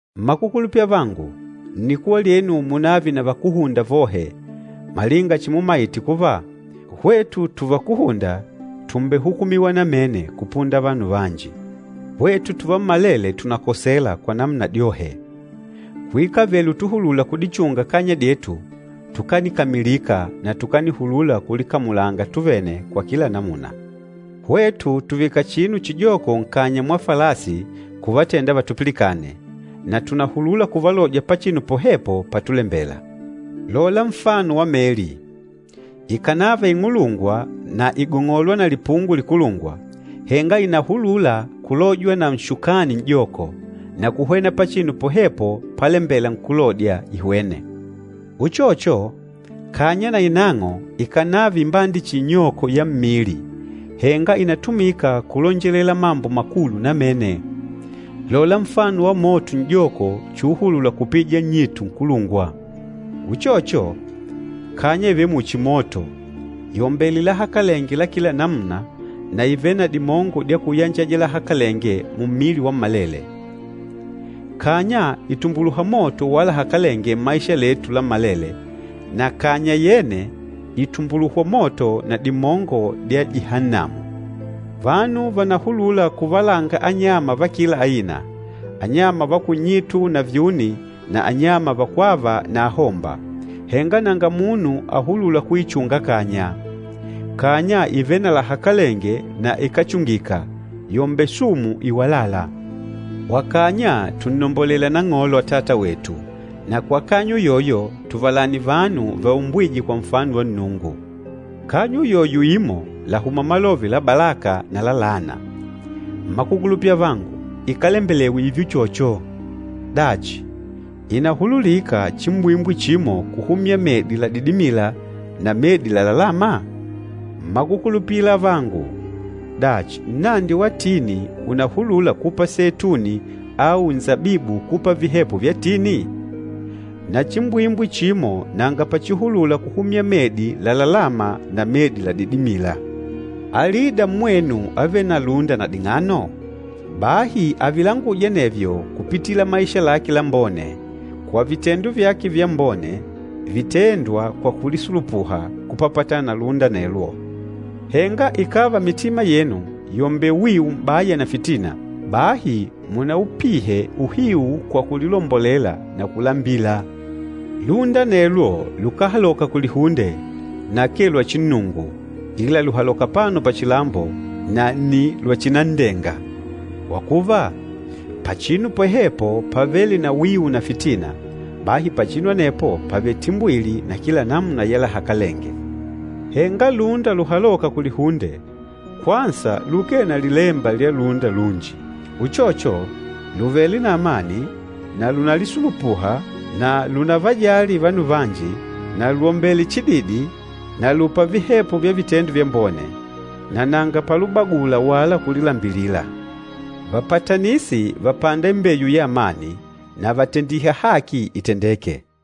Mmakukulupila avangu, nnikuwa lyenu munave na vakúhunda vohe, malinga chimumaite kuva, hwetu tuvakuhunda tùmbehukumiwa namene kupunda vanu vanji. Hwetu tuvammalele tùnakosela kwa namuna dyohe. Kuikavele utuhulula kudichunga kanya dyetu, tukanikamilika na tukanihulula kulikamulanga tuvene kwa kila namuna. Hwetu tùvika chinu chijoko nkanya mwa falasi kuvatenda vatupilikane, na tùnahulula kuvalodya pachinu pohepo patulembela. Lola nfano wa meli. Ikànava ing'ulungwa na ìgong'olwa na lipungo likulungwa, henga ìnahulula kulojwa na nshukani n'joko, na kuhwena pachinu pohepo pálembèlà nkúlodya ihwene. Uchocho, kanya nainang'o, ikànava imbande chihi inyoko ya mmili, henga ìnatumika kulonjelela mambo makulu namene. Lola nfano wa moto n'joko chuuhulula kupija nnyitu nkulungwa. Uchocho, kanya ìvele muchi moto, yòmbele lahakalenge la kila namuna na ìvele na dimongo dya kuyanjaja lahakalenge mummili wammalele. Kanya ìtumbuluha moto wa lahakalenge mmaisha letu lammalele, na kanya yene, ìtumbuluhwa moto na dimongo dya Jihannamu. Vanu vànahulula kuvalanga anyama va kila aina, anyama va kunnyitu na vyuni na anyama vakwâva na ahomba, henga nanga munu ahulûla kuichunga kanya. Kanya ìvele na lahakalenge na ikáchungika, yòmbele sumu iwalâla. Kwa kanya tùnnombolela Nang'olo Atata wetu, na kwa kanya uyoyo tùvalani vanu vaumbwîje kwa nfano wa Nnungu. Kanya uyoyo imo làhuma malove la balaka na la laana. Mmakukulupila avangu, ikálembelewa ììve uchocho! Dachi, ìnahululika chimbwimbwi chimo kuhumya medi ladidimîla na medi lalalâma? Mmakukulupila avangu, dachi nnandi wa tini ùnahulula kupa seituni, au nsabibu kupa vihepo vya tini? Na chimbwimbwi chimo nanga pachihulula kuhumya medi lalalâma na medi ladidimîla. Alida mmwenu avêle na lúnda na ding'ano? Bahi avilanguje anevyo kupitila maisha lake lambone, kwa vitendo vyake vyambone vitêndwa kwa kulisulupuha kupapatana na lúnda anelwo. Henga ikàva mitima yenu yòmbele wiu m'baya na fitina, bahi munaupihe uhiu kwa kulilombolela na kulambila. Lúnda anelwo lukáhaloka kulihunde, na akee lwachinnungu, ila lùhaloka apano pachilambo, na nni lwachinan'ndenga. Kwa kuva, pachinu pohepo pavêle na wiu na fitina, bahi pachinu anepo pàvele timbwili na kila namuna ya lahakalenge. Henga lúnda luhalôka kulihunde, kwansa lukee na lilemba lya lúnda lunji. Uchocho, lùvele na amani na lùnalisulupuha na lùnavajali vanu vanji na lwòmbele chididi na lùpa vihepo vya vitendo vyambone, na nanga palubagula wala kulilambilila. Vapatanisi vàpanda imbeyu ya amani, na vàtendiha haki itendeke.